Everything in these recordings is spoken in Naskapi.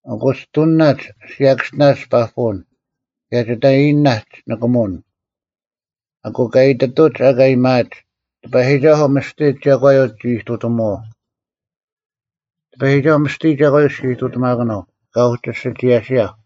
ᐊᑯ ᒋᑐᓂᓇᒡ ᓯᔭᑭᔅᒋᓇᒡ ᐸᐳᐅᓐ, ᑭᔭ ᒋᑕᔨᔨᓇᒡ ᓂᑭᒧᐅᓐ: ᐊᑯ ᑲ ᐃᑎᑐᒡ ᐊᑲ ᐊᔭᒥᐊᒡ, “ᑎᐸᔨᒋᒐᓱᐤ ᒥᔅᑎ ᒐᒂᔪᐤ ᒋ ᐃᑐᑎᒧᐛᐤ᙮” ᑎᐸᔨᒋᒐᓱᐤ ᒥᔅᑎ ᒐᒂᔪᐤ ᔅᒋ ᐃᑐᑎᒪᑯᓄᐤ, ᑲ ᐅᒋ ᓯᒋᔭᓯᔭᐧᒄ᙮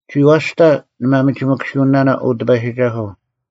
ᒋᐛᔅᑕ ᓂ ᒥᒪᒋᑯᓂᑯᓯᐅᓂᓇᓇ, ᐅ ᑎᐸᔨᒋᒐᓱᐤ,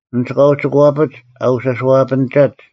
ᐊᓐᒡ ᑲ ᐅᒋᑯᐛᐱᒡ ᐊ ᐅᓯᔄᐛᐱᓂᒐᒡ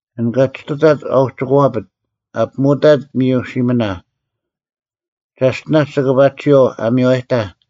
ᐊᓐ ᑲ ᒋᑐᑕᑦ ᐊ ᐅᒋᑯᐛᐱᑦ, ᐊ ᐱᒧᐅᑕᑦ ᒥᔪ ᓯᒥᓇ, ᒐᔅᑎᓇᔅ ᒋᑭ ᐸᒋ ᒋᐛᐤ ᐊ ᒥᔽᔨᑕᐧᒃ,